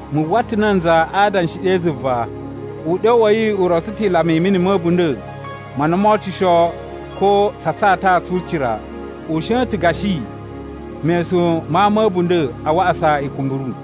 Mu uwwa ta̱ nanza a adanshi ɗe zuva. Uɗyo wa̱ yi u rotso ta̱ ilama i mini ma̱ a̱bunda̱ ma na mo ocusho ko tsa tsata tsu ucira. U shon ta̱ gashi mesun ma ama a̱ a̱bunda̱ a waꞌasa ikumburu.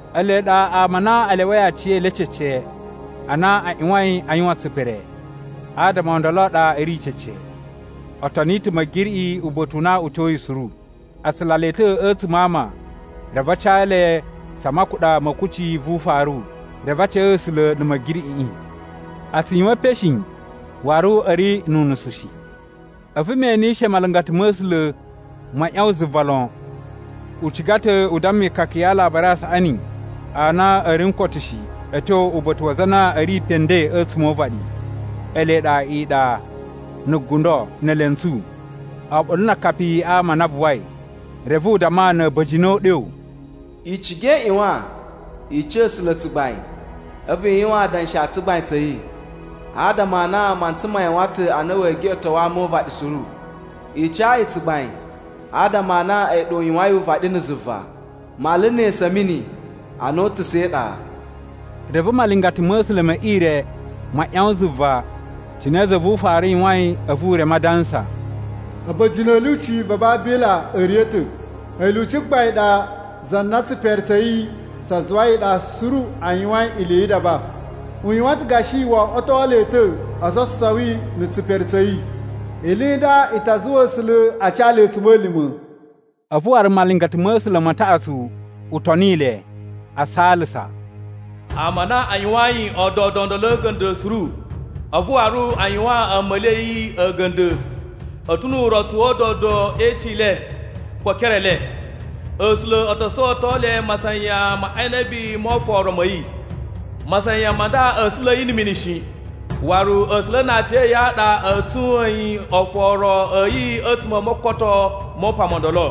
Ele ɗa ama a na a lyawai aciyele cece a na a ꞌyuwain a yuwan tsipere, adama o ndolo a ɗa a̱ ri cece. O toni ta̱ Ma̱giriꞌi uba̱ta̱ u na u tyoyi suru. A tsula le ta̱ a̱tsuma̱ a ama reve a ca le tsa makuɗa ma̱ kucci vu ufaru, reve a ca A̱sula̱ na̱ Ma̱giriꞌiꞌi. A tsu yuwan epen shi, waru a̱ ri nu unusu shi. A̱vu me enishe malingata ma̱ A̱sula̱ ma ꞌyawan zuva lon. U ciga ta̱ u damma ikaka ya Alabari a Saꞌani a na a̱ ri n koto shi a̱ tyo uba̱ta̱ wa aza a na a̱ ri pe nden a̱tsuma̱ o uvaɗi, ele ɗa iɗa, na̱ gundo, ne elentsu, oɓolo na akapi a ama a na buwai. Reve u damma na̱ a̱ba̱jini o uɗyo, “I ciga i ꞌyuwan i ca A̱sula̱ tsugbain a̱vu i yuwan adanshi a tsugbain tsa̱ yi. Adama a na mantsa ma yuwan ta̱ a na wee geꞌeto ama o uvaɗi suru. I ca yi tsugbain, adama a na a̱yi ɗa u yuwain uvaɗi na̱ zuva, mala ne esu a̱ mini a na o utusa̱ e iɗa.” Reve malingata ma̱ A̱sula̱ me ire ma ꞌyawan zuva cine za vu ufaru yuwain a̱vu u reme adansa, “A̱ba̱jini a̱ lyuci a Babila a̱ riya̱ ta̱! A̱yi lyuci gbain ɗa za na tsipere tsa̱ yi tsa zuwai iɗa suru a yuwain ili yi idaba. U yuwan ta̱ gashi wo oꞌwoto le ta̱ ososowi na̱ tsipere tsa̱ yi, ili i nda i ta zuwa A̱sula̱ a ca le a̱tsuma̱lima̱.” A̱vu waru malingata ma̱ A̱sula̱ ma taꞌatsu u toni le, a saalasa, “Ama a na a yuwayin a̱a̱dodo o ndolo a̱ga̱nda̱ suru a̱vu waru a yuwaan a̱a̱ma̱li a̱ yi a̱ga̱nda̱, a̱ ta̱ nu urotsu wa̱ a̱a̱dodo e icin i le ko e ekere e le. A̱sula̱ o to sowoto le masayan ma inabi mo oforo ma̱ yi. Masayan ma nda a̱ sula̱ yi na̱ mini shi, waru A̱sula̱ na aciya̱yi a ɗa a̱ tsuyin oforo a̱ yi a̱tsuma̱ o mokoto mo upan mo ndolo.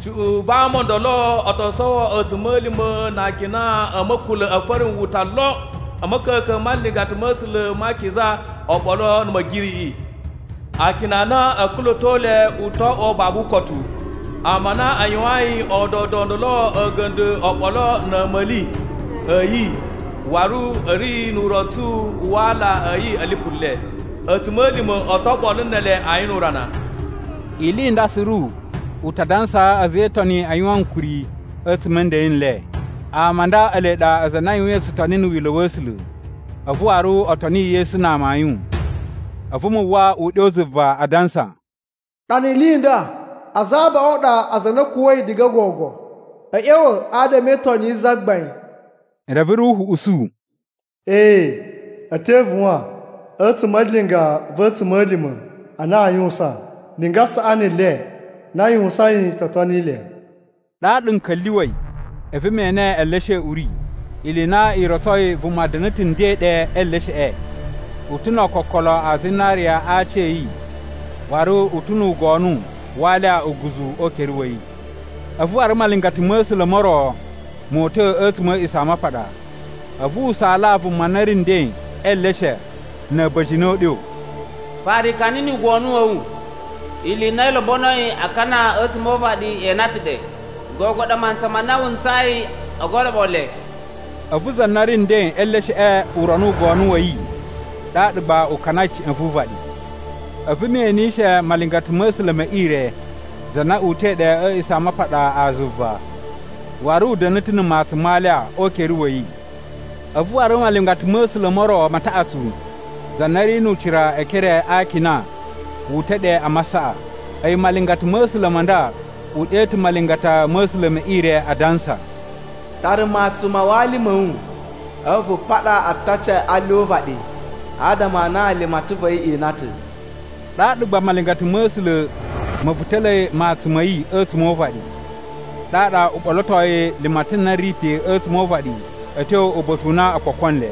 Cuꞌun va ama o ndolo o to sowo a̱tsuma̱lima̱ na akina a̱ ma̱kula̱ a̱ farinwuta lon a̱ ma̱ka̱ka̱n ma nlingata ma̱ A̱sula̱ ma akiza oɓolo na̱ Ma̱giriꞌiꞌi. Akina a na a̱a̱ kula̱to le u to oꞌwo babu ukotu. Ama a na a yuwayin a̱a̱dodo o ndolo a̱ga̱nda̱ oɓolo na̱ a̱a̱ma̱li a̱ yi waru a̱ ri nu urotsu wa ala a̱ yi a̱ lipu le, a̱tsuma̱lima̱ o to oɓolo ne ele ayin nu urana.” Ili i nda suru u ta dansaa a̱za̱ e Itoni a yuwan ankuri a̱tsuma̱ a̱ nden n le. Ama a nda ele ɗa aza a na a yuwain tsutoni na̱ wila̱ wa̱ A̱sula̱, a̱vu waru o toni Yesu na amayun. A̱vu mu uwwa uɗyo zuva adansa, “Ɗana ili i nda: Aza abaꞌun a ɗa aza a na a̱ kuwa̱i diga gogo a̱ ꞌya̱wa̱ adama e Itoni yi Zagbain!” Reve Ruhu usu, “Ee, a̱ te ivuwan a̱tsuma̱ a linga va̱ a̱tsuma̱lima̱ a na a yuwusan, linga saꞌani le na a yuwusain to toni le.” Ɗaɗa n ka̱lyuwa̱i, a̱vu me ene eleshe a̱ uri. Ili i na i rotsoi vuma da̱na̱ ta̱ nden ɗe e elesheꞌe. U ta̱ no ookokolo a zinariya a aaci a̱ yi waru u ta̱ nu ugonu wa alya uguzu o ukere wa̱ yi. A̱vu waru malingata ma̱ A̱sula̱ mo ro mo uta̱ a̱tsuma̱ a̱ A̱a̱ꞌisamapaɗa, a̱vu u saalaa vuma na ri nden e eleshe na̱ a̱ba̱jini o uɗyo, “Fara ikani nu ugonu wa̱ wu. Ili i na i lobonoi a kana a̱tsuma̱ o uvaɗi e ina ta̱ ɗe, gogo ɗa mantsa ma na wu ntsayi o goloɓo le.” A̱vu za na ri nden e elesheꞌe u rono ugonu wa̱ yi, ɗaɗa gba u kanai ca̱ꞌa̱n vu uvaɗi. A̱vu me enishe malingata ma̱ A̱sula̱ me ire za na uta̱i ɗe a̱ A̱a̱ꞌisamapaɗa a zuva, waru u da̱na̱ ta̱ na̱ matsun ma alya o ukere wa̱ yi. A̱vu waru malingata ma̱ A̱sula̱ mo ro ma taꞌatsu, za na ri nu ucira e ekere a akina, wu uta̱ ɗe a masaꞌa. A̱yi malingata ma̱ A̱sula̱ ma nda u ɗe ta̱ malingata ma̱ A̱sula̱ me ire adansa, “Tara matsun ma wali ma̱ wu a̱vu vu paɗa ataci a alya o uvaɗi adama a na limatan va̱ yi e ina ta̱.” Ɗaɗa gba malingata ma̱ A̱sula̱ ma̱ vuta̱la̱i matsun ma̱ yi a̱tsuma̱ o uvaɗi. Ɗaɗa u ɓolotoi limatan na ri pe a̱tsuma̱ o uvaɗi a̱ tyo uba̱ta̱ u na o kpoko nle.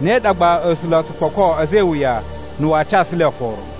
Ne ɗa gba A̱sula̱ o tsu kpoko a̱za̱ e iwuya na̱ waa casu le oforo.